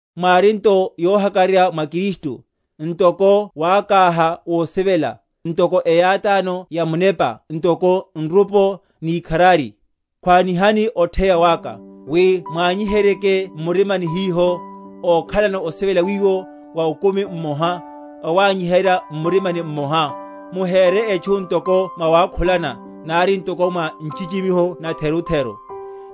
Mwári nto yohakararya mwa Kristu, ntoko wákáha wosivela, ntoko eyátáno ya Munepa, ntoko nrupo, ni ikharari. Khwanihani otheya waka, wi mwanyiheryeke m’murima hiho, ókhalano osivela wiwo, a okumi mmoha, awanyiherya m’murima mmoha; muhére etchu ntoko mwawakhulana, nari ntoko mwa nchichimiho natherutheru,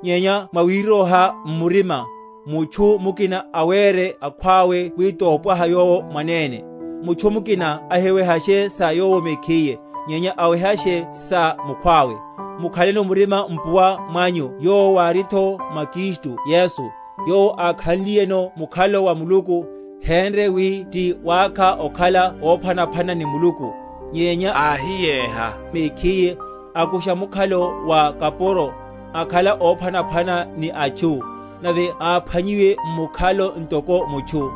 nyenya mwawiroha m’murima, mutchu mukina awére akhwawe wi tompwaha yowo mwanene; mutchu mukina ahiwehashe sa yowo mekhiye, nyenya awehashe sa mukhwawe. Mukhaleno murima mpuwa mwanyu yowo wáritho mwa Kristu Yesu, Yowo ákhanliyeno mukhalo wa Muluku, hénre wi ti wákha okhala óphwanaphwana ni Muluku, nyenya áhiyéha mekhiye, akusha mukhalo wa kapuro, akhala óphwanaphwana ni atchu; nave áphwanyiwiye m’mukhalo ntoko mutchu,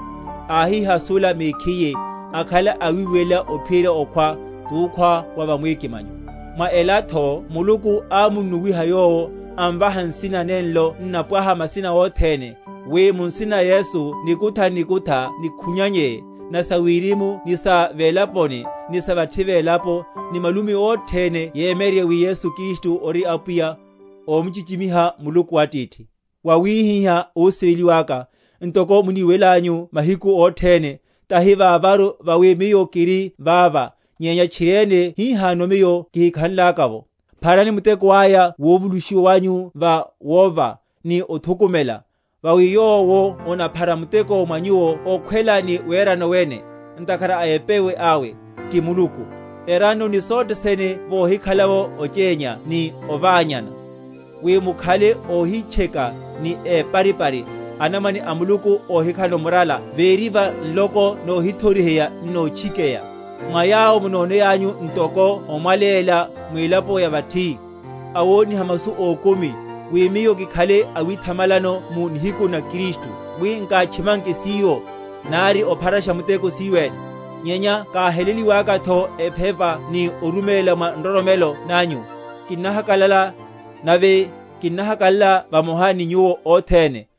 áhihasula mekhiye, akhala awiwelela ophiyerya okhwa, tukhwa wa va mwikimanyo. Mwa elatho Muluku ámunnuwiha Yowo, amvaha nsina nenlo n’napwaha masina othene, wi mu nsina na Yesu nikutha n’nikutha níkhwinyanye, na sa wirimu ni sa velaponi, ni sa vathi velapo, ni malumi othene yomyeryerye wi Yesu Kristu ori Apwiya, omchichimiha Muluku Atithi. Vawihihá, ósiveliwáka, ntoko muniwelanyu mahiku othene, tahi vavaru vawi miyo kiri vava, nyenya tchiriene hihano miyo kihikhanlaka’vo, pharani muteko aya wovulushiwa wanyu va wova, ni othukumela; vawi yowo onaphara muteko mwa nyuwo okhwela ni werano wene, ntakhara a epewe awe, ti Muluku. Erannoni sothe sene vohikhala’vo ochénya ni oványana, wi mukhale óhitcheka ni éparipari, anamwane a Muluku óhikhalano murala véri va nloko nohithoriheya n’notchikeya, mwa yawo munoneyanyu ntoko omwaleya mwilaponi ya vathi, awoniha masu ókumi; wi miyo kikhale awithamalano mu nihiku na Kristu, wi nkátchimanke siyo, nari opharasha muteko siyo ene. Nyenya káheliwakatho ephepa ni oruméla mwa nroromelo nanyu, kinnahakalala, nave kinnahakalala vamoha ni nyuwo othene;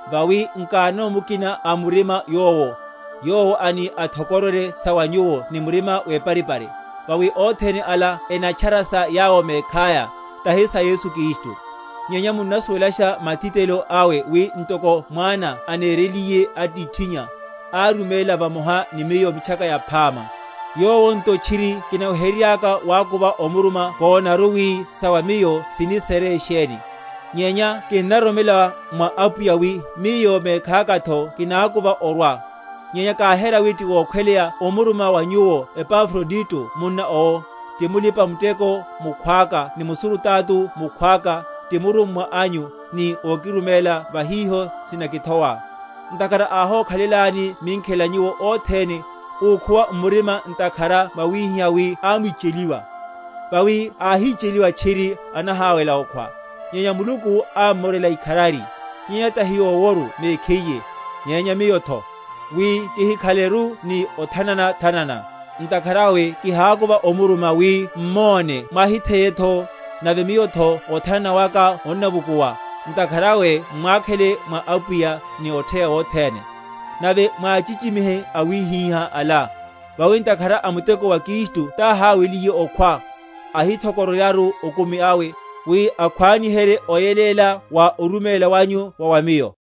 Vawi nkanono mukina a murima yowo, yowo ani athokororye sa wa nyuwo ni murima weparipari. Vawi othene ala enatchara sa yawo mekhaya, tahi sa Yesu Kristu. Nyenya munnasuwelasha matitelelo awe, wi, ntoko mwana anereliye atithinnya, áruméla vamoha ni miyo Mitchaka Yaphama. Yowo nto tchiri kinaweheryeryaka wakuva omuruma kónaru wi sa wa miyo sini sere sheni; nyenya kinnaroromela mwa Apwiya wi miyo mekhakatho kinákuva orwa. Nyenya káhera wi tiwokhweleya omuruma wa nyuwo Epafrodito munna owo, ti mulipa‐muteko mukhwaka ni musurutato mukhwaka, ti murummwa anyu, ni ókiruméla va hiho sinakithowa; ntakhara áhókhalelani minkhela nyuwo othene, úkhuwa m’murima ntakhara mwáhiwa wi ámwicheliwa. Vawi áhicheliwa tchiri anahawela okhwa; nyenya Muluku ámmorela ikharari; nyenya tahi yoworu mekhiye, nyenya miyotho, wi kihikhaleru ni othanana‐thanana. Ntakhara awe kihákuva omuruma, wi m’monne mwahitheyetho, nave miyotho othanana waka onnavukuwa. Ntakhara awe m’mwakhele mwa Apwiya, ni otheya wothene; nave mwáchichimihe awihiha ala; vawi ntakhara a muteko wa Kristu táhaweliye okhwa, ahithokororyaru okumi awe, wi akhwaniherye oyeléla wa oruméla wanyu wa wa miyo.